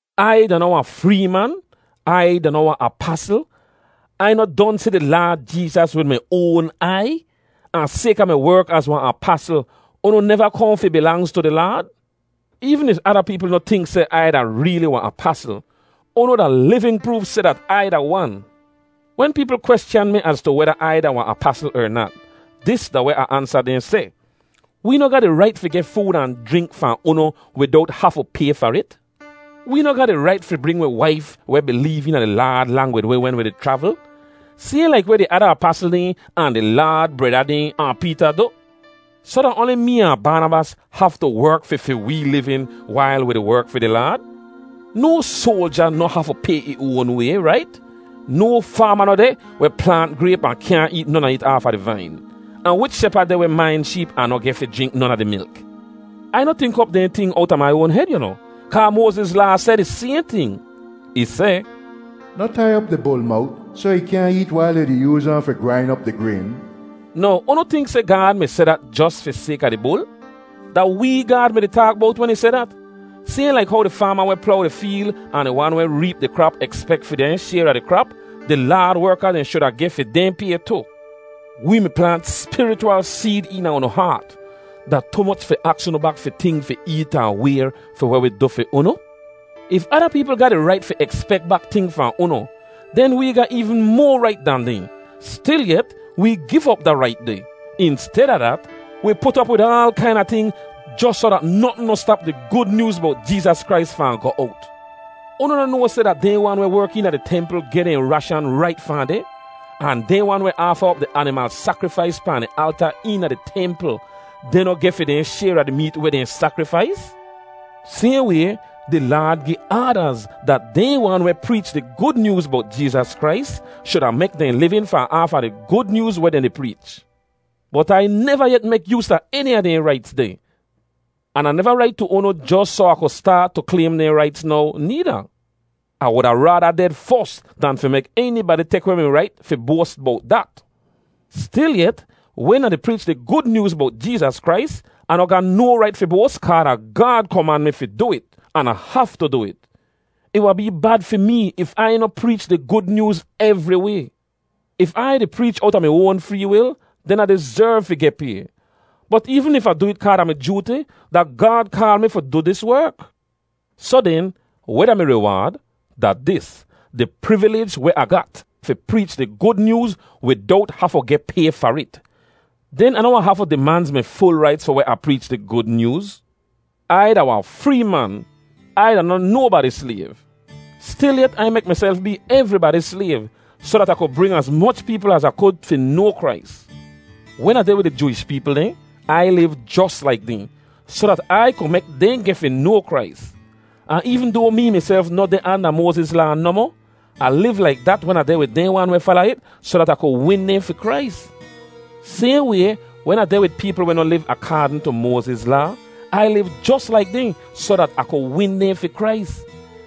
Ai da noh wahn free man? Ai da noh wahn apasl? Ai noh don si di Laad Jeezas wid mi oan aiy? Ahn sayka mi werk az wahn apasl, unu neva kohn fi bilangz tu di Laad? Eevn if ada peepl noh tink seh Ai da reeli wahn apasl, unu da livin proof seh dat Ai da wan. Wen peepl kweschan mi az tu weda Ai da wahn apasl er nat, dis da weh Ah ansa dehn seh: Wee noh ga di rait fi geh food ahn jrink fahn unu widowt hafu pay far it? Wee noh ga di rait fi bring wi waif weh bileev eena di Laad lang wid wi wen wi di chravl, sayhn laik weh di ada apasl dehn, ahn di Laad breda dehn, ahn Peeta du? Soh da oanli mee ahn Baanabas haftu werk fi fi wee livin wail wi di werk fi di Laad? No soalja noh hafu pay ih oan way, rait? No faama noh deh weh plaant grayp ahn kyaahn eet non a it aafa di vain. Ahn wich shepad deh weh main sheep ahn noh geh fi jrink non a di milk? Ai noh tink op dehn ting owta mai oan hed yu noh, kaa Moaziz Laa seh di sayhn ting. Ih seh, “Noh tai op di bul mowt soh ih kyaahn eet wail yu di yooz ahn fi grain op di grayn.” Now, unu tink seh Gaad mi seh dat jos fi sayka di bul? Da wee Gaad mi-di taak bowt wen ih seh dat. Sayhn laik how di faama weh plow di feel ahn di wan weh reep di krap ekspek fi dehn shayr a di krap, di Laad werka dehn shuda geh fi dehn pay tu. Wee mi plaant spirichwal seed eena unu haat. Da tu moch fi aks unu bak fi ting fi eet ahn wayr fi weh wi du fi unu? If ada peepl ga di rait fi ekspek bak ting fahn unu, den wee ga eevn moa rait dan dehn. Stilyet, wee giv op da rait deh. Insteda dat, wi put op wid aal kaina ting jos soh dat notn noh stap di Gud Nyooz bowt Jeezas Krais fahn goh owt. Unu noh noa seh dat dehn wan weh werk eena di templ geh dehn rashan rait fahn deh? Ahn dehn wan weh aafa op di animal sakrifais pahn di alta eena di templ, dehn noh geh fi dehn shayr a di meet weh dehn sakrifais? Sayhn way, di Laad gi aadaz dat dehn wan weh preech di Gud Nyooz bowt Jeezas Krais shuda mek dehn livin fahn aafa di Gud Nyooz weh dehn di preech. Bot Ai neva yet mek yoos a eni a dehn raits deh. An Ah neva rait tu unu jos soh Ah ku staat tu klaym dehn raits now needa. Ah wuda raada ded fos dan fi mek enibadi tek weh mi rait fi boas bowt dat. Stilyet, wen Ah di preech di Gud Nyooz bowt Jeezas Krais, Ah noh ga no rait fi boas kaa da Gaad koman mi fi du it an Ah haftu du it. Ih wahn bee bad fi mee if Ai noh preech di Gud Nyooz evriway. If Ai di preech owta mi oan free wil, den Ah dizerv fi geh pay. Bot eevn if Ah du it kaa da mi jooti, da Gaad kaal mee fi du dis werk. Soh den, weh da mi riwaad? Da dis: di privilij weh Ah gat fi preech di Gud Nyooz widowt hafu geh pay far it. Den Ah noh wahn hafu dimanz mi ful raits fi weh Ah preech di Gud Nyooz. Ai da wahn free man. Ai da noh nobadi slayv. Stilyet, Ai mek miself bee evribadi slayv, soh dat Ah ku bring az moch peepl az Ah kud fi noa Krais. Wen Ah deh wid di Jooish peepl dehn, Ai liv jos laik dehn, soh dat Ai ku mek dehn geh fi noa Krais. Ahn eevn doa mee miself noh deh anda Moaziz Laa nohmoh, Ah liv laik dat wen Ah deh wid dehn wan weh fala it soh dat Ah ku win dehn fi Krais. Sayhn way, wen Ah deh wid peepl weh noh liv akaadn tu Moaziz Laa, Ai liv jos laik dehn soh dat Ah ku win dehn fi Krais.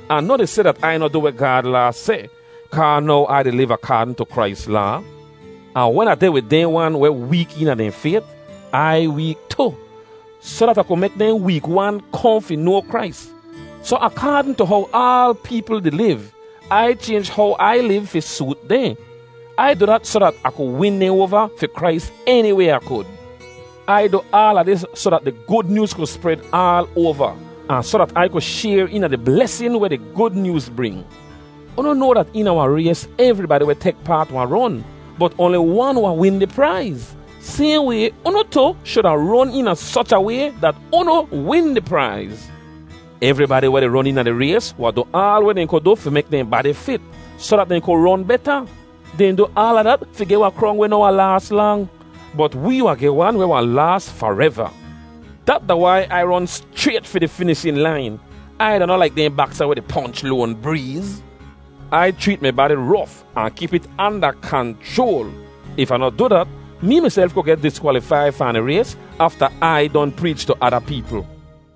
Ah noh di seh dat Ai noh du weh Gaad Laa seh, kaa now Ai di liv akaadn tu Krais Laa. Ahn wen Ah deh wid dehn wan weh week eena dehn fayt, Ai week tu, soh dat Ah ku mek dehn week wan kohn fi noa Krais. Soh akaadn tu how aal peepl di liv, Ai chaynj how Ai liv fi soot dehn. Ai du dat soh dat Ah ku win dehn oava fi Krais eni way Ah kud. Ai du aala dis soh dat di Gud Nyooz ku spred aal oava, ahn soh dat Ai ku shayr eena di blesin weh di Gud Nyooz bring. Unu noa dat eena wahn rays evribadi weh di tek paat wahn ron, bot oanli wan wahn win di praiz. Sayhn way, unu tu shuda ron eena soch a way dat unu win di praiz. Evribadi weh di ron eena di rays wahn du aal weh dehn ku du fi mek dehn badi fit, soh dat dehn ku ron beta. Dehn du aala dat fi geh wahn krong weh noh wahn laas lang. Bot wee wahn geh wan weh wahn laas fareva. Dat da wai Ai ron schrayt fi di finishin lain. Ai da noh laik dehn baksa weh di ponch loan breez. Ai chreet mi badi rof, ahn kip it anda kanchroal. If Ah noh du dat, mee miself ku geh diskwalifai fahn di rays afta Ai don preech tu ada peepl.